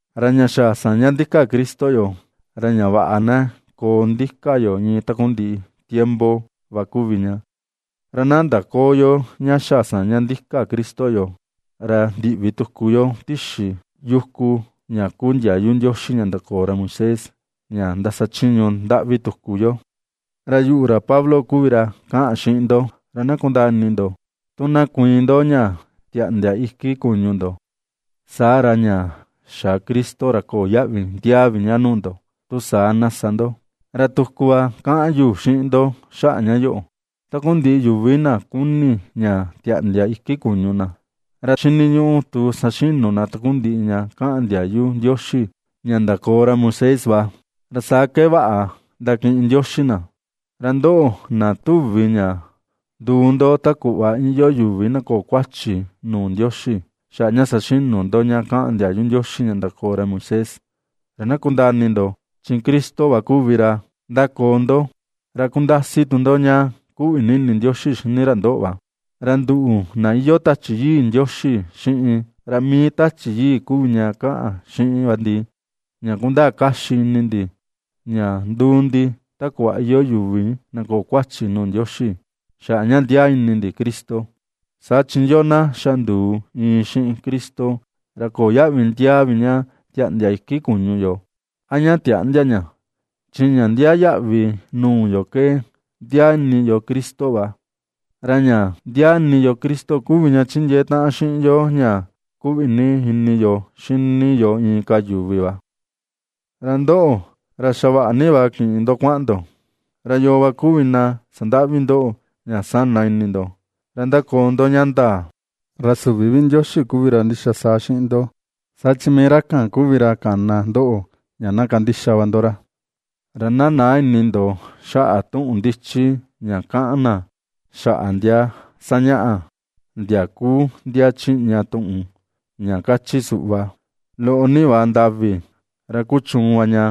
Ra ña xa saña ndika Cristo yoo, ra ña vaꞌa na koo ndika yo iin takundiꞌi tiempo va kuvi ña; ra na ndaköo yo ña xa saña ndika Cristo yoo, ra ndiꞌvi tuku yo tixi yuku ña kuu ndiayu Ndioxi ña ndakoo ra Moisés, ña ndasachiñu ndaꞌvi tuku yo. Ra yuꞌu, ra Pablo kuvi ra kaꞌan xiꞌin ndo, ra na kundaa ini ndo, tu na kuiin ndo ña tiaꞌndia iku kuñu ndo, saa ra ña xa Cristo, ra köo yaꞌvi ndiaa vi ña nuu ndo, tu saa na sa ndo. Ra tuku va kaꞌan yu xiꞌin ndo xaꞌa ña yoꞌo, takundiꞌi yuvi na kuni ña tiaꞌndia iki kuñu na, ra xiniñuꞌu tu saxinu na takundiꞌi ña kaꞌan ndiayu Ndioxi ña ndakoo ra Moisés va, ra saa ke vaꞌa ndakiꞌin Ndioxi na. Ra ndoꞌo, na tuvi ña nduu ndo ta kuꞌva iyoo yuvi na köo kuachi nuu Ndioxi, xaꞌa ña saxinu ndo ña kaꞌan ndiayu Ndioxi ña ndakoo ra Moisés, ra na kundaa ini ndo, chi Cristo va kuvi ra ^ndakoo ndo, ra kundasi tu ndo ña kuꞌvi ini Ndioxi xini ra ndoꞌo va. Ra nduꞌu, na iyoo Tachi Yii Ndioxi xiꞌin ra mii Tachi Yii kuvi ña kaꞌan xiꞌin va ndi ña kundaa kaxi ini ndi, ña nduu ndi ta kuꞌva iyoo yuvi na köo kuachi nuu Ndioxi, xaꞌa ña ndiaa ini ndi Cristo. Saa chi yoo na xa nduu iin xiꞌin Cristo, ra köo yaꞌvi ndiaa vi ña tiaꞌndia iki kuñu yo a ña tiäꞌndia ña. Chi ña ndiaa yaꞌvi nuu yo ke ndiaa ini yo Cristo va, ra ña ndiaa ini yo Cristo kuvi ña ^chindiee taꞌan xiꞌin yo ña ^kuꞌvi ini yo xini yo inka yuvi va. Ra ndoꞌo, ra xa vaꞌa ni va kiꞌin ndo kuaꞌan ndo, ¿ra yoo va kuvi na sandaꞌvi ndoꞌo ña sana ini ndo, ra ^ndakoo ndo ña ndaa? Ra süvi vi Ndioxi kuvi ra ndixa saa xiꞌin ndo, saa chi mii ra kan kuvi ra kana ndoꞌo ña na kandixa va ndo ra. Ra na näa ini ndo, xaꞌa tuꞌun ndichi ña kaꞌan na xaꞌa ndia sañaꞌa, ndia kuu ndia chiꞌña tuꞌun, ña kachi suꞌva: “Loꞌo ni va ndavi ra kuchuun va ña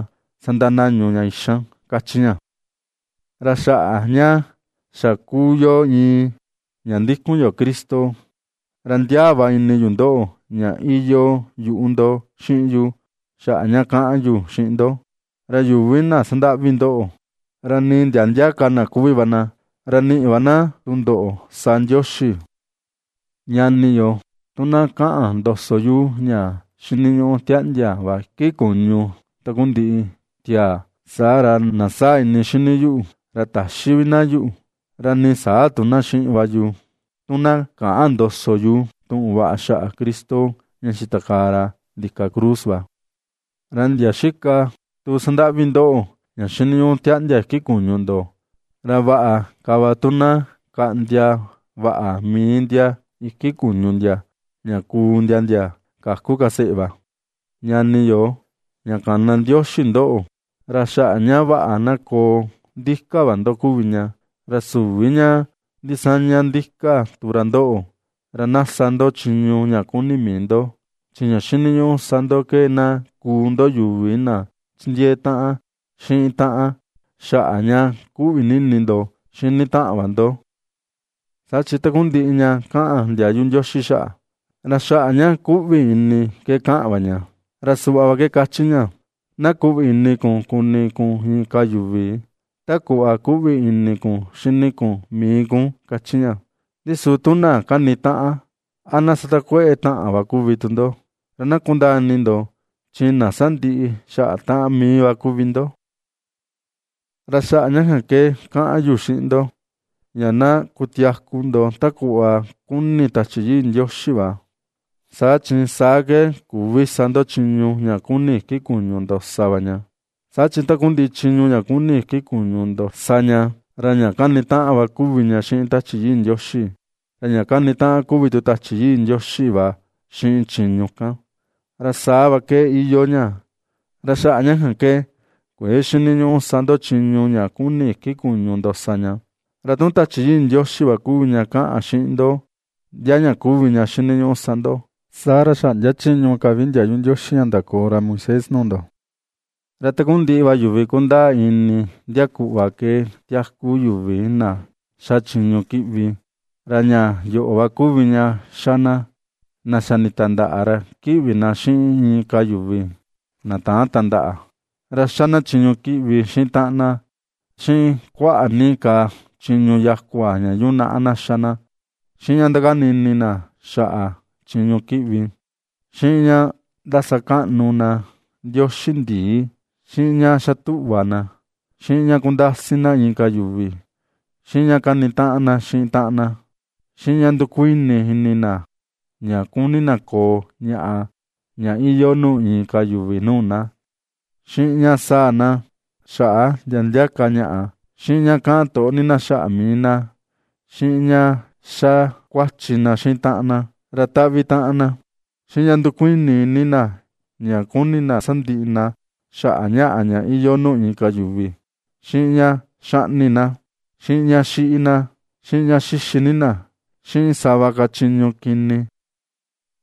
sandanañu ña ixan”, ^kachi ña. Ra xaꞌa ña xa kuu yo iin, ña ndikun yo Cristo, ra ndiaa va ini yu ndoꞌo ña iyoo yuꞌu ndo xiꞌin yu xaꞌa ña kaꞌan yu xiꞌin ndo. Ra yuvi na sandaꞌvi ndoꞌo, ra nii ndia ndia ka na kuvi va na, ra niꞌi va na tundoꞌo sa Ndioxi. Ñani yo, tu na kaꞌan ndoso yu ña xiniñuꞌu tiaꞌndia va iki kuñu takundiꞌi tiaa, saa ra, na saa ini xini yuꞌu, ra täxi vi na yuꞌu, ra nii saa tu na xiꞌin va yu tu na käꞌan ndoso yu tuꞌun vaꞌa xaꞌa Cristo ña xitakaa ra ndika cruz va. Ra ndia xika tu sandaꞌvi ndoꞌo, ña xiniñuꞌu tiaꞌndia iki kuñu ndo, ra vaꞌa ka va tu na kaꞌndia vaꞌa mii ndia iki kuñu ndia, ña kuu ndia, ndia käku ka seꞌe va. Ñani yo, ña kana Ndioxi ndoꞌo, ra xaꞌa ña vaꞌa na koo ndika va ndo kuvi ña. Ra süvi ña ndisaña ndika tu ra ndoꞌo, ra na sa ndo chiñu ña kuni mii ndo, chi ña xiniñuꞌu sa ndo ke na kuu ndo yuvi na chindiee taꞌan xiꞌin taꞌan xaꞌa ña kuꞌvi ini ndo xini taꞌan va ndo. Saa chi takundiꞌi ña kaꞌan ndiayu Ndioxi xaꞌa, ra xaꞌa ña kuꞌvi ini ke kaꞌan va ña, ra suꞌva ke kachi ña: “Na kuꞌvi ini kun kuni kun inka yuvi ta kuꞌva kuꞌvi ini kun xini kun mii kun”, kachi ña. Ndi su tu na kanitaꞌan, a na satakueꞌe taꞌan va kuvi ndo, ra na kundaa ini ndo, chi na sandiꞌi xaꞌa taꞌan mii va kuvi ndo. Ra xaꞌa ña kan ke kaꞌan yu xiꞌin ndo: Ña na kutiaku ndo ta kuꞌva kuni Tachi Yii Ndioxi va, saa chi saa ke küvi sa ndo chiñu ña kuni iki kuñu ndo sa va ña. Saa chi takundiꞌi chiñu ña kuni iki kuñu sa ña, ra ña kanitaꞌan va kuvi ña xiꞌin Tachi Yii Ndioxi, ra ña kanitaꞌan kuvi tu Tachi Yii Ndioxi va xiꞌin chiñu kan. Ra saa va ke iyoo ña, ra xaꞌa ña kan ke kuëe xiniñuꞌu sa ndo chiñu ña kuni iki kuñu ndo sa ña. Ra tu Tachi Yii Ndioxi kuvi ña kaꞌan xiꞌin ndo ndia ña kuvi ña xiniñuꞌu sa ndo, saa ra xäꞌndia chiñu ka vi ndiayu Ndioxi ña ndakoo ra Moisés nuu ndo. Ra takundiꞌi va yuvi kundaa ini ndia kuꞌva ke tiaku yuvi na xa chiñu kiꞌvi, ra ña yoꞌo va kuvi ña xa na: Na xa nitandaꞌa ra kiꞌvi na xiꞌin inka yuvi, na täan tandaꞌa, ra xa na chiñu kiꞌvi xiꞌin taꞌan na, xiꞌin kuaꞌa ni ka chiñu yakua ña yunaꞌa na xa na, xiꞌin ña ndakani ini na xaꞌa chiñu kiꞌvi, xiꞌin ña ndasakaꞌnu na ndioxi ndii, xiꞌin ña xa tuꞌva na, xiꞌin ña kundasi na inka yuvi, xiꞌin ña kanitaꞌan na xiꞌin taꞌan na, xiꞌin ña ndukuini ini na ña kuni na koo ñaꞌa ña iyoo nuu inka yuvi nuu na, xiꞌin ña sáa̱ na xaꞌa ndia ndia ka ñaꞌa, xiꞌin ña kaꞌan toꞌo ni na xaꞌa mii na, xiꞌin ña xa kuachi na xiꞌin taꞌan na, ra taꞌvi taꞌan na, xiꞌin ña ndukuini ini na ña kuni na sandiꞌi na xaꞌa ñaꞌa ña iyoo nuu inka yuvi, xiꞌin ña xaꞌni na, xiꞌin ña xiꞌi na, xiꞌin ña xixi ni na, xiꞌin sava ka chiñu kini.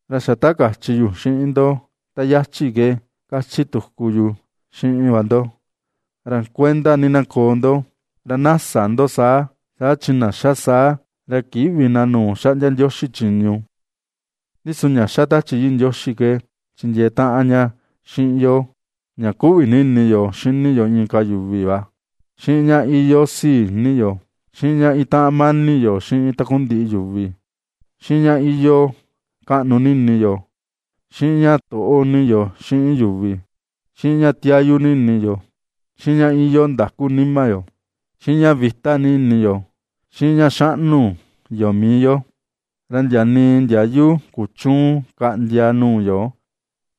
Ra xa ta kachi yu xiꞌin ndo ta yachi ke kachi tuku yu xiꞌin va ndo, ra kuenda ni na koo ndo, ra na sä ndo saa, saa chi na ^xa saa, ra kïꞌvi vi na nuu xaꞌndia Ndioxi chiñu. Ndi su ña ^xa Tachi Yii Ndioxi ke chindiee taꞌan ña xiꞌin yo ña ^kuꞌvi ini yo xini yo inka yuvi va, xiꞌin ña iyoo sii ini yo, xiꞌin ña itaꞌan mani yo xiꞌin takundiꞌi yuvi, xiꞌin ña iyoo kaꞌnu ini yo, xiꞌin ña toꞌo ni yo xiꞌin yuvi, xiꞌin ña tiayu ni yo, xiꞌin ña iyoo ndaku nima yo, xiꞌin ña vita ini yo, xiꞌin ña xaꞌnu yo mii yo. Ra ndia nii ndiayu kuchüun kaꞌndia nuu yo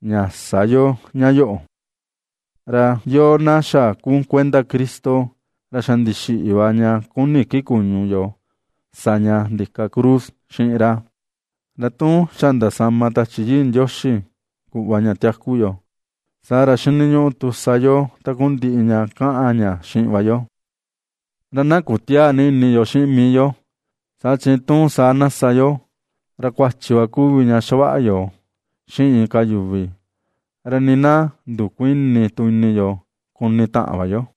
ña sä yo ña yoꞌo. Ra yoo na xa kuu kuenda Cristo, ra xa ndixiꞌi va ña kuni iki kuñu yo sa ña ndika cruz xiꞌin ra. Ra tu xa ndasama Tachi Yii Ndioxi kuꞌva ña tiaku yo, saa ra xiniñuꞌu tu sa yo takundiꞌi ña kaꞌan ña xiꞌin va yo. Ra na kutiäa ni ini yo xiꞌin mii yo, saa chi tu saa na sa yo, ra kuachi va kuvi ña xavaꞌa yo xiꞌin inka yuvi, ra nii na ndukuïni tu ini yo kuni taꞌan va yo.